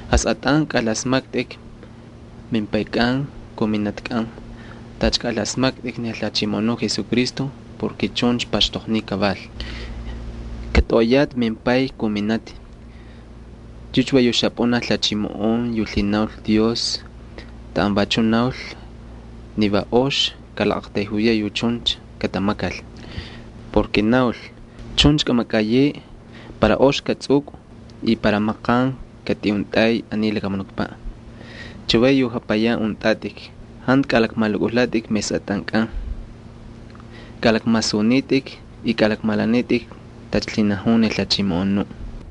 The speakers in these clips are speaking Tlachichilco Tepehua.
Jasꞌatꞌan kaꞌalasmaktꞌik mimpaykꞌan kun minatkꞌan tacha kaꞌalasmaktꞌikcha ni Jalhachimoꞌonuꞌ Jesucristo porke chuncha paxtoqniy. “Katꞌoꞌoyatꞌi mimpay kun minati.” Yucha va yu xapꞌunaj lhachimoꞌon yu lhinaul Dios taꞌan vachuꞌ naul ni va ox kalaqꞌaqtayjuyaꞌ yu chuncha katamakal. Va naul: “Chuncha kꞌamakꞌayeꞌe para ox kꞌatsꞌukꞌu y para maqan kꞌatꞌiꞌukxuntꞌay aniy lakamunukpaꞌ.” Chavay yu japayan untꞌatꞌik jantu kꞌalakmalukꞌujlatꞌik mesꞌatꞌankꞌan. Kꞌalakmasunitꞌik y kꞌalakmalanitꞌik tacha lhinajun ni Jalhachimoꞌonuꞌ.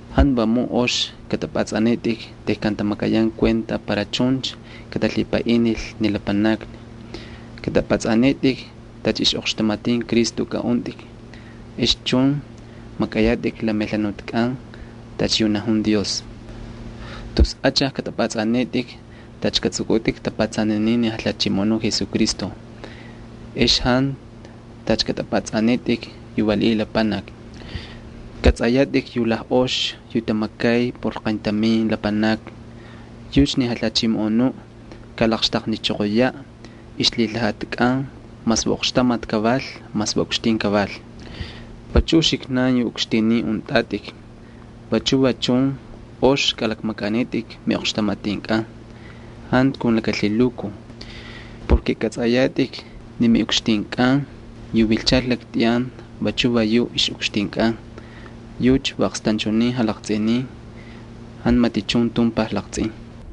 Jantu vamun ox kꞌatꞌapꞌatsꞌanitꞌik tejkan tamakayan kuenta para chuncha katalhipaꞌinil ni lapanakni. Kꞌatꞌapꞌatsꞌanitꞌik tacha ixꞌoqxtamatin Cristo kꞌaꞌuntꞌik, ex chun makꞌayatꞌik la melhanutkꞌan tacha yu najun Dios. Tus achaj kꞌatꞌapꞌatsꞌanitꞌik tacha katsꞌukꞌutꞌik tapatsaninin ni Jalhachimoꞌonuꞌ Jesucristo, ex jantu tacha kꞌatꞌapꞌatsꞌanitꞌik yu valiꞌiy lapanaki. Kꞌatsꞌayatꞌik yu lajꞌox yu tamakay por qayntamin lapanaki yucha ni Jalhachimoꞌonuꞌ kalaqxtaqnichoqoyaꞌ ixlhilhajatkꞌan, mas va oqxtamati kaval, mas va ukxtin kaval. Vachu uxiknan yu ukxtinin untꞌatꞌik vachu va chun ox kꞌalakmakꞌanitꞌik miꞌoqxtamatinkꞌan jantu kun laka lhilukuj. Va kꞌatsꞌayatꞌik ni miꞌukxtinkꞌan yu vilchal laktꞌiyan vachu va yuꞌ ixꞌukxtinkꞌan. Yucha va aqstanchunin jalaqtsꞌinin, jantu matichun tumpaj laqtsꞌin.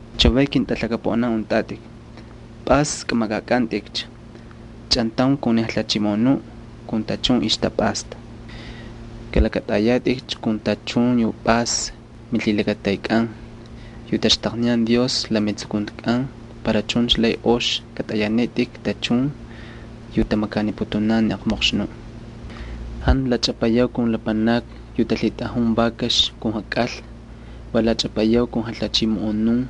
Chavay, ketꞌalaqaunin, pꞌas kꞌamakꞌakꞌantꞌikcha chꞌantaun kun ni Jalhachimoꞌonuꞌ kun tachun ixtapꞌasta. Kꞌalakꞌatꞌayatꞌikcha kun tachun yu pꞌas milhilakataykꞌan yu taxtaqniyan Dios la metsukuntikꞌan para chuncha lay ox katꞌayanitꞌik tachun yu tamakaniputunan ni aqmoqxnuꞌ. Jantu lachꞌapayau kun lapanakni yu talhitꞌajun vakax ali jakꞌalna. Va lachꞌapayau kun jalhachimoꞌonun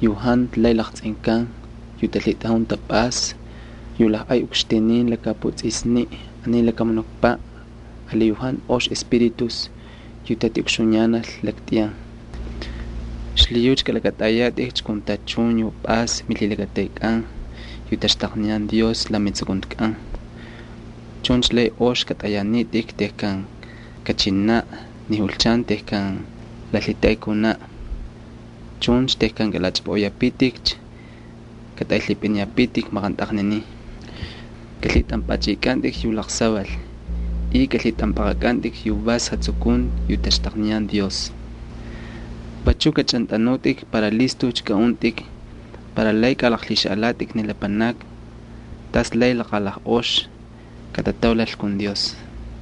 yu jantu lay laqtsꞌinkan, yu talhitꞌajun tapꞌasta, yu lajꞌay ukxtinin laka japutsꞌisniꞌ aniy lakamunukpaꞌ ali yu jantu ox espíritus yu tatiꞌukxuyanal laktꞌiyan. Xlhiyucha kalakꞌatꞌayatꞌikcha kun tachun yu pꞌas milhilakataykꞌan yu taxtaqniyan Dios la metsukuntikꞌan. Chuncha lay ox kꞌatꞌayanitꞌik tejkan kachinaꞌ ni julchan tejkan la lhitaꞌay kunaꞌ. Chuncha tejkan kꞌalachꞌapꞌaꞌoyapitikcha katꞌaylhipꞌiniyapitik maqantaqninin. Kꞌalhitꞌanpꞌachꞌikꞌantꞌik yu laqsaval y kꞌalaqlhitꞌampꞌaqꞌakꞌantꞌik yu vas jatsukunti yu taxtaqniyan Dios. Vachuꞌ kꞌachꞌantꞌanutꞌik para listujcha kꞌaꞌuntꞌik para lay kꞌalaqlhixaꞌalatꞌik ni lapanakni tas lay laqalajꞌox katataulal kun Dios.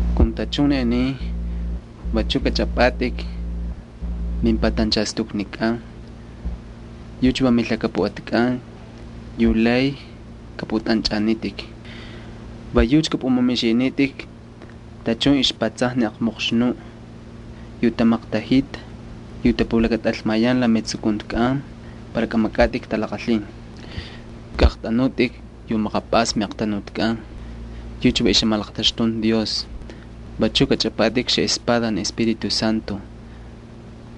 Kun tachun ni aniy, vachuꞌ kꞌachꞌapꞌatꞌik mimpatanchastuknikꞌan, yucha va milhakapuꞌatkꞌan yu lay kꞌapꞌutꞌanchꞌanitꞌik. Va yucha kꞌapꞌumamixinitꞌik tachun ixpatsajni ni aqmoqxnuꞌ yu tamaktajita yu tapulakatꞌalmayan la metsukuntikꞌan para kꞌamakꞌatꞌik talaqalhin. Kꞌaꞌaqtꞌanutꞌik yu maqapꞌasni miꞌaqtanutkꞌan, yucha va ixjamalaqtaxtunti Dios. Vachu kꞌachꞌapꞌatꞌik xaꞌespada ni Espíritu Santo,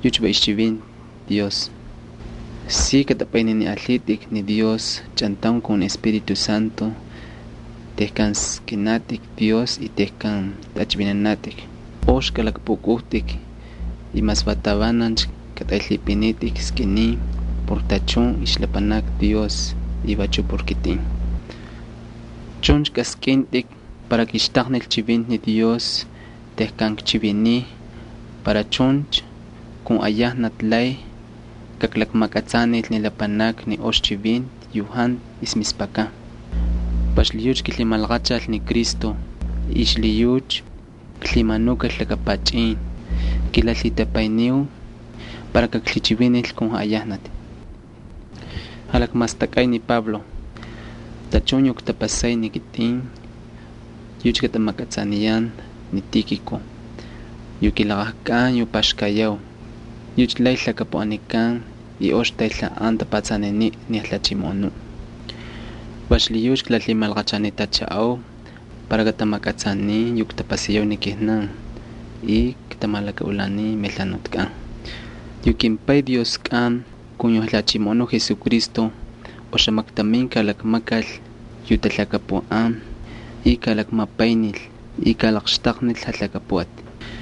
yucha va ixchivinti Dios. Si kꞌatꞌapꞌayniniꞌalhitꞌik ni Dios chꞌantaun kun ni Espíritu Santo tejkan skꞌiniyatꞌik Dios y tejkan tꞌachꞌivinanatꞌik. Ox kꞌalakpꞌukꞌujtꞌik y mas va tavanancha katꞌaylhipꞌintꞌik skꞌininin por tachun ixlapanakni Dios y vachu por kitꞌin. Chuncha kaskꞌintꞌik para kixtaqnil chivinti ni Dios tejkan kchiviniy para chuncha kun ayajnati lay kaklakmakꞌatsanil ni lapanakni ni ox chivinti yu jantu ixmispakan. Va xlhiyucha kilhimalaqachal ni Cristo y xlhiyucha klhimanukal laka pachꞌin. Kilalhitapayniu para kaklhichivinil kun jaꞌayajnati tacha maqskꞌiniy kakchivinil. Tachun yu ktapasay ni kitꞌin yucha katamakꞌatsaniyan ni Tíkiko yu kilaqajkꞌan yu paxkayau. Yucha lay lhakapuꞌanikan y ox taylhaꞌan tapatsaniniꞌ ni Jalhachimoꞌonuꞌ. Va xlhiyucha klalhimalaqachanitachaꞌau para katamakꞌatsanin yu ktapasayau ni kijnan y katamalakaꞌulanin melhanutkꞌan. Yu kimPay Dioskꞌan kun yu Jalhachimoꞌonuꞌ Jesucristo oxamaktamin kalakmakal yu talhakapuꞌan y kalakmapaynil y kalaqxtaqnil jalhakapuꞌati.